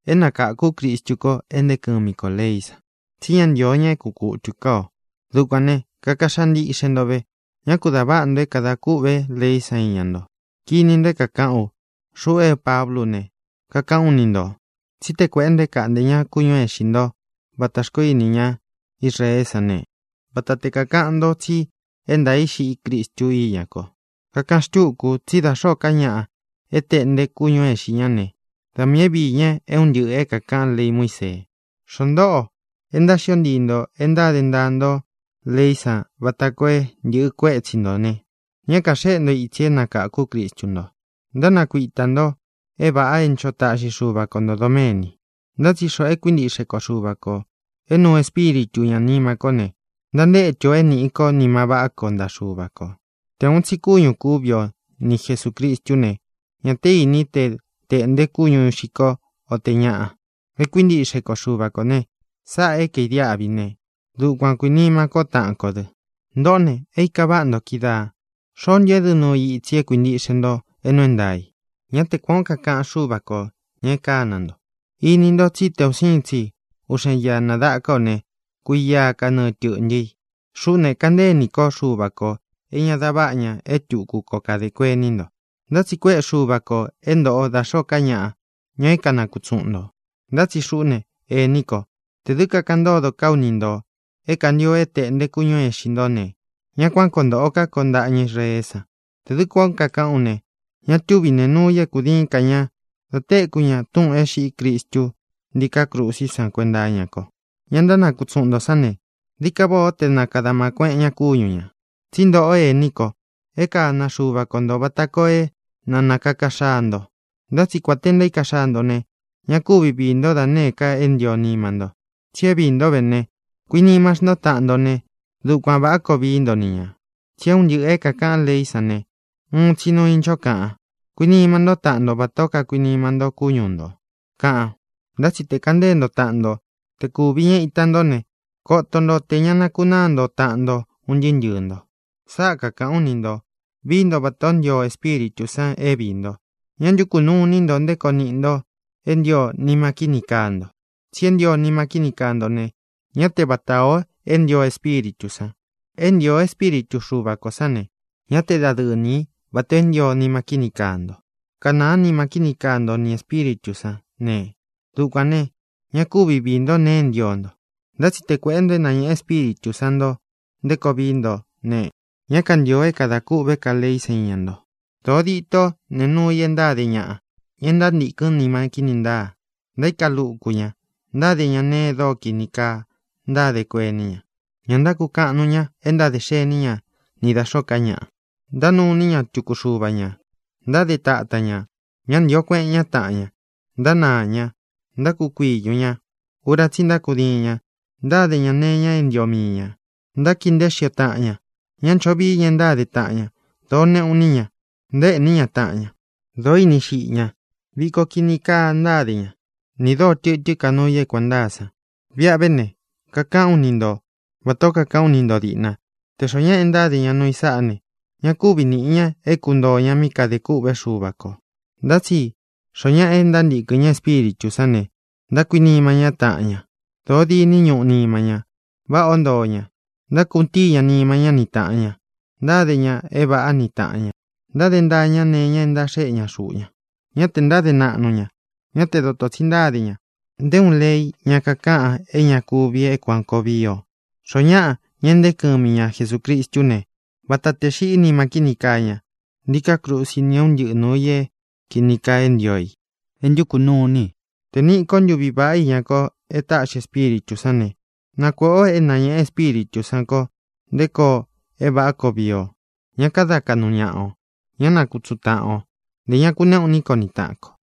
É nakáku Cristu ko e nteé kɨmi kō leí san, tsi ñá ntīo ña é kuꞌun kutū ká ō. Dukuān ne, kaka xaa ntiꞌxe nto ve; ñá ku dā váꞌa nto é kadā kûꞌvé leí san iña nto. Kini nto é kākaꞌán u. Xuꞌú e Pablú u ne, kakaꞌán u ni ntō tsí te kuēꞌé nto é kāꞌnté ña kúñū é īxi nto vata xkoó ini ñá Israeé san ne, vata te kākaꞌan ntó tsi é ntaā í xiꞌí Cristu íña ko. Kakaꞌan xtúku u tsí da xōó ka ñaꞌa é tēꞌnte kúñū é īxi ñá ne, da miī é viī ña é un ntɨꞌɨ̄ é kākaꞌán lei Muísee. Xoó ntoꞌo e ntáxio ntii nto e ntáde ntaa nto leí san vata koo é ntɨ̄ꞌɨ kuétsi ntō ne, ña kaxéꞌe nto itsi é nakākú Cristu nto; ntánakuitā nto é vāꞌa é ncho taꞌxi Xuva ko ntō doméni. Ntá tsi xoꞌō é kuintiꞌxe ko Xuva kō, é nuu Espíritu ñā nima kó ne, ntantétu ō é nīꞌi ko nima vaꞌá ko ntaꞌa Xuva kō. Tē uun tsi kúñū kúvi o ni Jesūcristú ne, ñā té ini te teꞌnte kúñu ixi ko, o tē ñaꞌa. É kuintiꞌxe ko Xuva kō ne, sáꞌā é kaīdiáꞌvi ne, dukuan kuīnima ko taꞌan kó dɨ. Ntōꞌó ne, é īka váꞌa ntō kídaā. ¿Xoó ntu édɨ nuu i itsi e kuíntiꞌxe nto é nuu é ntaā i? Ñá te kuān ó kakaꞌan Xúva kō, ña é kana nto. Ini nto tsí te un siin tsi uꞌxen ia nādaka ó ne, kuia kanɨɨ tɨ̄ꞌntɨ i. Xuꞌú ne, kanteé iní ko Xuva kō é ña da váꞌa ña é tuku koo kadā kuení nto. Ntá tsi kuéꞌe Xuva kō é ntoꞌo da xōó ka ñaꞌa, ña é kanakutsuꞌun ntō. Ntá tsi xuꞌú ne, ení ko, tē dɨ́ kakaꞌan ntódo ká u ni ntō é kāntio é tēꞌnte kúñu ixi nto ne, ñá kuan koo ntōꞌo ká ko ntaꞌa ña Israeé san. Tē dɨ́ kuān ó kakaꞌán u ne, ña túvi nēe nuu i é kūdiín ka ña dá tekū ña túꞌūn é xiꞌí Cristu ntíká krusí san kuenta iña ko. Ña ntánakutsuꞌun ntō sán ne, dií ka váꞌā ó te na kāda aꞌma kueꞌen ñá kúñu ñā. Tsí ntōꞌó, ení ko, é kana Xuva ko ntō vata koo é na nakāka xaa nto. Ntá tsi kuān te ntaíka xaa nto ne, ña kúvi viī ntó da nēé ka é ntio nima ntó, tsi é viī ntó ve ne, kuinima xntó taꞌan nto ne, dukuan vāꞌá koo vií nto ni ñā. Tsi é un ntɨꞌɨ̄ é kakaꞌán leí san ne, uun tsi nuu i ncho kaꞌan: “Kuinima ntó taꞌan nto vatā ó kakuinima nto kúñu ntō”, kaꞌan. Ntá tsi te kaꞌan ntée nto taꞌan nto, te kūvi ña ita ntó ne, koto nto tē ña nakunaa nto taꞌan nto un ntɨɨ́ ntɨɨ̄ nto. Sáꞌa kakāꞌán u ni ntō: Vií nto vatā ó ntio Espíritū san é viī nto; ñá ntukū nuu iní nto nté koo niꞌi nto é ntio nima kíni kaa nto. Tsi é ntio nima kíni kaa nto ne, ñá te vata ō é ntio Espíritū san. É ntio Espíritu Xuva kō sán ne, ñá te dadɨɨ nī í vatā o é ntio nima kíni kaa nto. Kanāá nima kíni kaa nto ni Ēspíritū sán ne, Dukuān ne, ña kúvi viī ntó nēe é ntio nto. Ntá tsi te kuēꞌé nto é nañēꞌe Espíritū san nto nté koo vií nto ne, ñá kantīo é kadā kûꞌvé ka leí san iña nto. Dōo ditó nēe nuu i e ntáde ñaꞌa, ña e ntántīkɨ́n nima kíni ntáa. Ntaíka luku ña. Ntáde ña nēe e dóo kini kaa ntádē kuení ña. Ña ntákukaꞌan nuu ña e ntádē xení ña ni da xōó ka ñaꞌa. Ntánuu iní ña tuku xuva ñā. Ntáde tatan ñā. Ñá ntīo kueꞌen ñá taꞌan ña. Ntánaā ña. Ntákukuiñū ña. Ura tsí i ntákudiin ña. Ntáde ñā nee iña é ntio mii ñā. Ntákii nteé xio ña taꞌan ña. Ña ncho vii ña e ntáde taꞌan ña. Dōó neꞌu iní ña. Ntaéꞌní ña taꞌan ña. Dōó ini xiꞌi ña. Viko kini kaa ntáde ña, ni dōó tɨtɨ́n ka nuu i é kuān ntáa san. Viꞌa ve ne, kakaꞌán u ni nto vatā ó kakaꞌán u ni nto dīꞌna, tē xoó ñaꞌa ntáde ña nuu i sáꞌā ne, ña kúvi nīꞌi ña é kuntōo ña mí kadē kûꞌvé Xuva kō. Ntá tsi xoo ñáꞌa e ntántīkɨn ña Espíritū sán ne, ntákuinima ñá taꞌan ña. Dōó diní ñuꞌu nima ña. Váꞌā ó ntoo ña. Ntákutíi ña nima ñá ni tāꞌan ña. Ntáde ñā é vāꞌá ni tāꞌan ña. Ntáde ntaa ña nee iña é ntaxéꞌe ña xuꞌu ña. Ñá tē ntáde naꞌnu ña. Ñá te dotō tsi ntáde ña. Nté uun lei ña kakaꞌan é ña kuvi é kuān koo vii o. Xoó ñaꞌa, ña é ntee kɨmi ña Jesūcristú ne, vata tē xiꞌí nima kíni kaa ña ntíkā krusi ni é un ntɨꞌɨ nūu i é kīni kaa é ntio i, é ntukū nuu iní i. Tē é nīꞌi ko ntuví vaꞌá iña ko e táꞌxi Espíritū sán ne, na kuēꞌé ō é nañēꞌe Espíritū sán kō nté koo é vāꞌá koo vii o. Ñá kada kaꞌnu ñaꞌa ō. Ñá nakutsuꞌun taꞌan ō. Ntē ña kuneꞌu iní ko ni taꞌan kō.